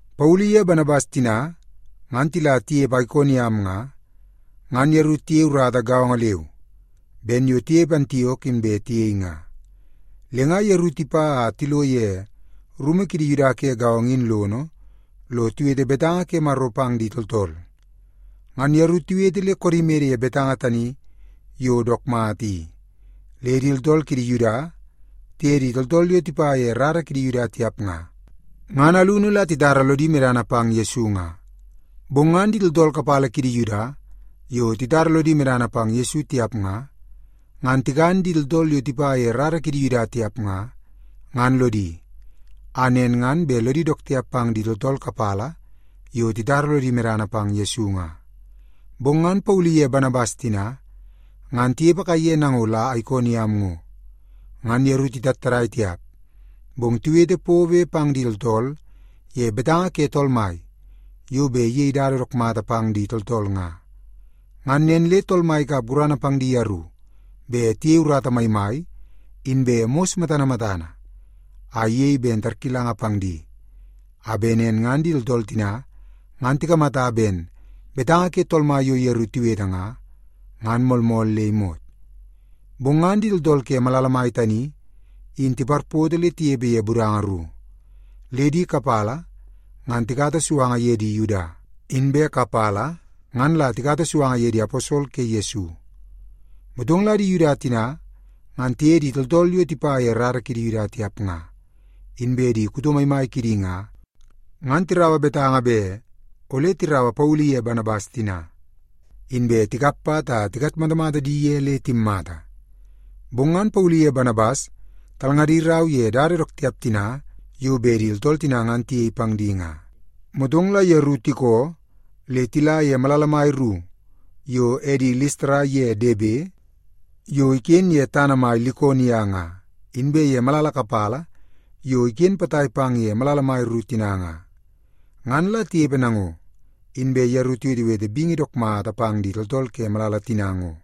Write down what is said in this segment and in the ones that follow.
Paulu iye Banabas tina ngan tila tinepe Aikoniam nga, ngan yeru tiyei urata gaongo leu ben yo tinepe Antiok inbe tiyei nga. Le nga yeru tipa a tilo ye rumu kidi Yuda ke gaongo in lono lo tiwete betanga ke Maro pang di tooltool. Ngan yeru tiwete le koodi mede ye betanga tani yo dook mata i, le di tooltool kidi Yuda tiye di tooltool yo tipa ye rara kidi Yuda tiap nga, ngan alunu la titara lodi medana pang Yesu nga. Bong ngan di tooltool kapala kidi Yuda yo titara lodi medana pang Yesu tiap nga, ngan tikan di tooltool yo tipa ye rara kidi Yuda tiap nga, ngan lodi, a nen ngan bet lodi dook tiap pang di tooltool kapala yo titara lodi medana pang Yesu nga. Bong ngan Paulu iye Banabas tina ngan tinepe kaiye nango la Aikoniam ngo. Ngan yeru titattadai tiap, bong tiwete pobe pang di tooltool ye betanga ke Tool Mai yo bet iyei dada dook mata pang di tooltool nga. Ngan nen le Tool Mai ikap gurana pang di yeru bet tiyei urata maimai, inbe mos matana matana a iyei ben tarkilanga pang di, a bet nen ngan di tooltool tina ngan tikamata ben betanga ke Tool Mai yo yeru tiwete nga, ngan moolmool le imot. Bong ngan di tooltool ke malala mai tani in tiparpoto le tinepe ye budanga ru. Le di kapala ngan tikata suanga ye di Yuda, inbe kapala ngan la tikata suanga ye di aposol ke Yesu. Motong la di Yuda tina ngan tiye di tooltool yo tipa ye rara kidi Yuda tiap nga, inbe di kuto maimai kidi nga, ngan tiraua betanga bet ole tiraua Paulu iye Banabas tina, inbe tikap pat a tikatmatamata di ye le timmata. Bong ngan Paulu iye Banabas talngadi rau ye dada dook tiap tina yo bet di tooltool tina ngan tiyei pang di nga, motong la yeru tikoo le tila ye malala mai ru yo edi Listara ye Debe, yo iken ye tana mai Likonia nga, inbe ye malala kapala yo iken potai pang ye malala mai ru tina nga. Ngan la tinepe nango, inbe yeru tiwetewete bingi dook mata pang di tooltool ke malala tina ngo.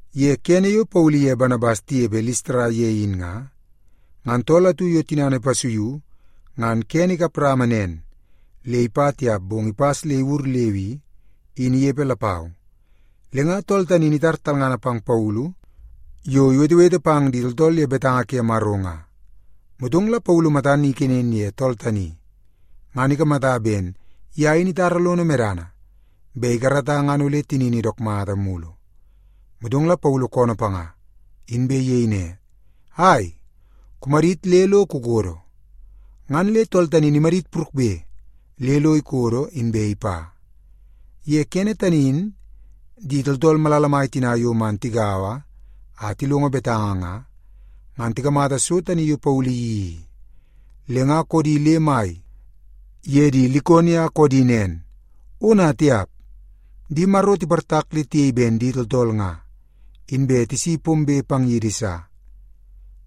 Ye kene yo Paulu iye Banabas tinepe Listara ye in nga, ngan tool atu yo tinana ipasuiu ngan kene ikap rama nen le ipa tiap bong ipas le iwur leu i, in inepe lapau. Le nga tool tani in itar talngana pang Paulu yo iwetewete pang di tooltool ye betanga ke Maro nga. Motong la Paulu matan kenen ye tool tani, ngan ikamata ben ye in itara lono medana bet ikarata ngan ole tinini dook mata. Motong la Paulu koonoo panga, inbe iyei ne, “Ai, kumadit le lo kukodo!” Ngan le tool tani in imadit purukbe le lo ikodo, inbe ipa. Ye kene tani in di tooltool malala mai tina yo man tigaua a tilongo betanga nga, ngan tikamata so tani yo Paulu iyeii i, le nga koodi le mai ye di Likonia koodi nen, “Ona tiap! Di maro tiportak le tiyei ben di tooltool nga, inbe tisi pombe pang yidi sa!”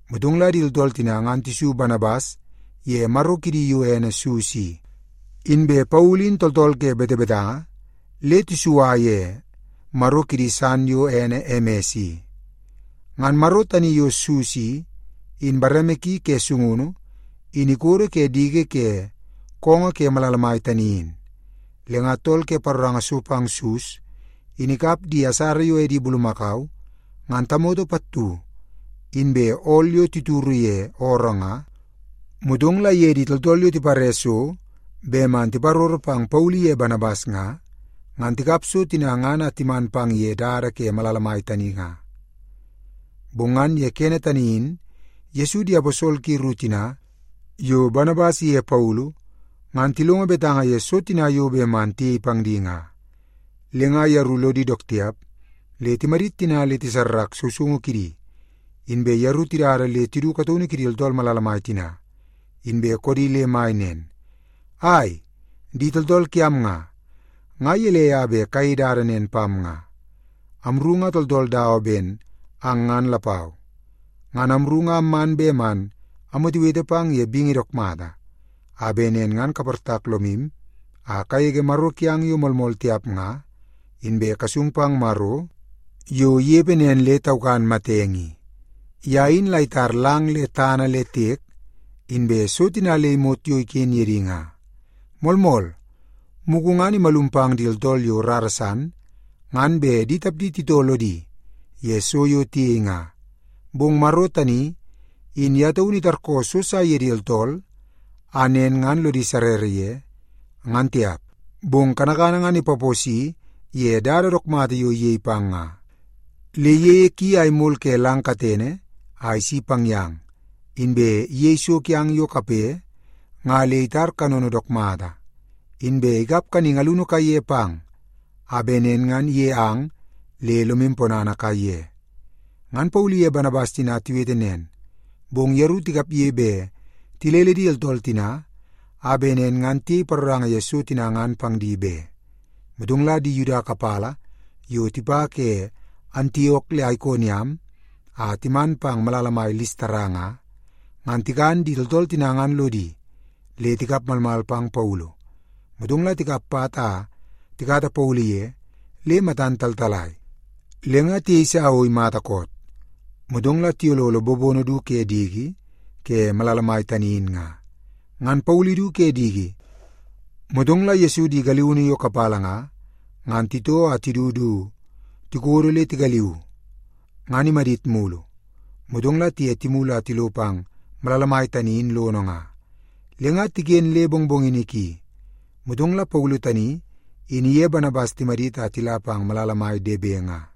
Motong la di tooltool tina ngan tisu Banabas ye maro kidi yo ene Sus i. Inbe Paulu in tooltool ke betebetanga le tisua ye maro kidi san yo ene Emes i. Ngan maro tani yo Sus i, in bareme ki ke sungunu in ikodo ke diki ke koongoo ke malala mai tani in. Le nga tool ke paroranga so pang Sus in ikap di asara yo edi bulumakau ngan tamoto pattu inbe ool yo tituru ye ooroo nga, motong la iye di tooltool yo tipare so bet man tiparoro pang Paulu iye Banabas nga, ngan tikap so tina ngan a timan pang ye dada ke malala mai tani nga. Bong ngan ye kene tani in Yesu di aposol ki ru tina yo Banabas iye Paulu, ngan tilongo betanga ye so tina yo bet man tiyei pang di nga. Le nga yeru lodi dook tiap le timadit tina le tisarrak sousoungu kidi, inbe yeru tidada le tidu kataunu kidi tooltool malala mai tina, inbe koodi le mai nen, “Ai, di tooltool kiam nga, nga gelei a bet kayei dada nen pam nga? Amru nga tooltool dawa ben ang ngan lapau. Ngan amru nga amman bet man amwetewete pang ye bingi dook mata, a bet nen ngan kaportak lomu a kagege maro kiang yo moolmool tiap nga, inbe kasung pang Maro yo inepe nen le taukan matenge i. Ye in la itar lang le tana le tiek, inbe so tina le imot yo iken ye di nga. Moolmool, mugu ngan imalum pang di tooltool yo rara san ngan bet di tapdi titoo lodi ye so yo tiyei nga. Bong Maro tani in ye taunu itarkoo so sa ye di tooltool a nen ngan lodi sarrara ye, ngan tiap. Bong kanakana ngan ipaposi ye dada dook mata yo iyei pang nga. Le iyeie ki a imol ke lang katene a isi pang yang, inbe iyei so kiang yo kape nga le itar kanono dook mata, inbe ikap kaningi alunu kaiye pang a bet nen ngan ige ang le lomu ponana kaiye.” Ngan Paulu iye Banabas tina tiwete nen, bong yeru tikapge bet tilele di tooltool tina a bet nen ngan tiyei paroranga ye so tina ngan pang di be. Motong la di Yuda kapala yo tipa ke Antiok le Aikoniam a timan pang malala mai Listara nga, ngan tikan di tooltool tina ngan lodi, le tikap malmal pang Paulu. Motong la tikap pat a tikata Paulu ye le matan taltalai, le nga tiyeisa o imata koot, motong la tiyololo bobono du ke diki ke malala mai tani in nga. Ngan Paulu idu ke diki, motong la Yesu di galiunu yo kapala nga, ngan titoo a tidu du tikodo le tigaliuu, ngan imadit mulu, motong la tiye timulu a tilo pang malala mai tani in lono nga. Le nga tiken le mongmongini ki, motong la Paulu tani in iye Banabas timadit a tila pang malala mai Debe nga.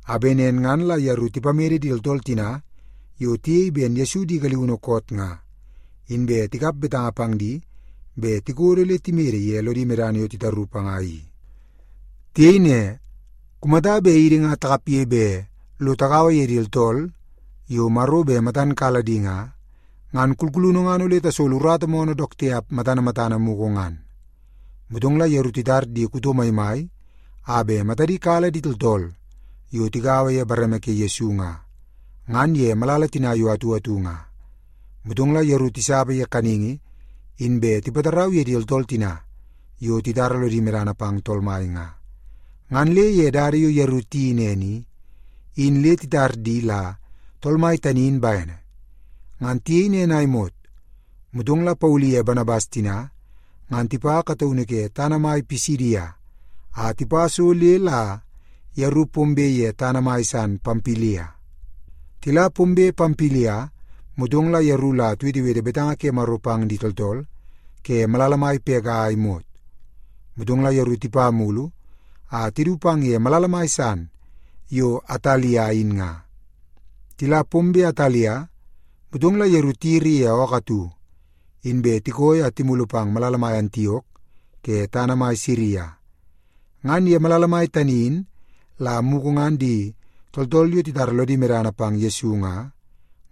a bet nen ngan la yeru tipamede di tooltool tina yo tiyei ben Yesu di galiunu koot nga, inbe tikap betanga pang di bet tikodo le timede ye lodi medana yo titaru panga i. Tiyei ne, “Kumata bet idi nga takapge bet lo tagaua ye di tooltool yo Maro bet matan kala di nga, ngan kulkulunu ngan ole tasolo urata moonoo dook tiap matana matana mugu ngan.” Motong la yeru titar di kuto maimai a bet matadi kala di tooltool yo tigaua ye bareme ke Yesu nga, ngan ye malala tina yo atu atu nga. Motong la yeru tisapa ye kaningi inbe tipatarau ye di tooltool tina yo titara lodi medana pang Tool Mai nga. Ngan le ye dada yo yeru tiyeii nen i, in le titar di la Tool Mai tani in bene. Ngan tiyei nen a imot, motong la Paulu iye Banabas tina ngan tipa kataunu ke tana mai Pisidia, a tipa so le la yeru pombe ye tana mai san Pampilia. Tila pombe Pampilia, motong la yeru la tiwetewete betanga ke Maro pang di tooltool ke malala mai Pega a imot. Motong la yeru tipa mulu a tidu pang ye malala mai san yo Atalia in nga. Tila pombe Atalia, motong la yeru tiyiri ye ookoo atu, inbe tikooi a timulu pang malala mai Antiok ke tana mai Siria. Ngan ye malala mai tani in la mugu ngan di tooltool yo titara lodi medana pang Yesu nga,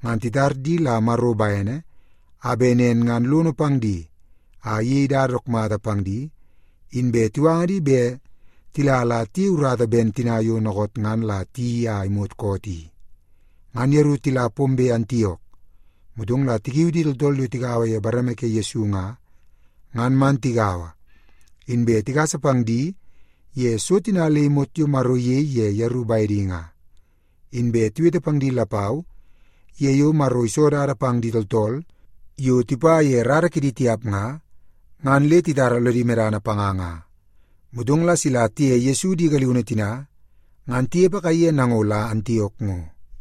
ngan titar di la Maro bene a bet nen ngan lono pang di a iyei dada dook mata pang di, inbe tiwanga di bet tila la tiyei urata ben tina yo dookoot ngan la tiyeii a imot koot i. Ngan yeru tila pombe Antiok, motong la tikiu di tooltool yo tigaua ye bareme ke Yesu nga, ngan man tigaua, inbe tigasa pang di ye so tina le imot yo Maro iyei ye yeru bedi nga. Inbe tiwete pang di lapau ye yo Maro iso dada pang di tooltool yo tipa ye rara kidi tiap nga, ngan le titara lodi medana panga nga. Motong la sila tiye Yesu di galiunu tina ngan tinepe kaiye nango la Antiok ngo.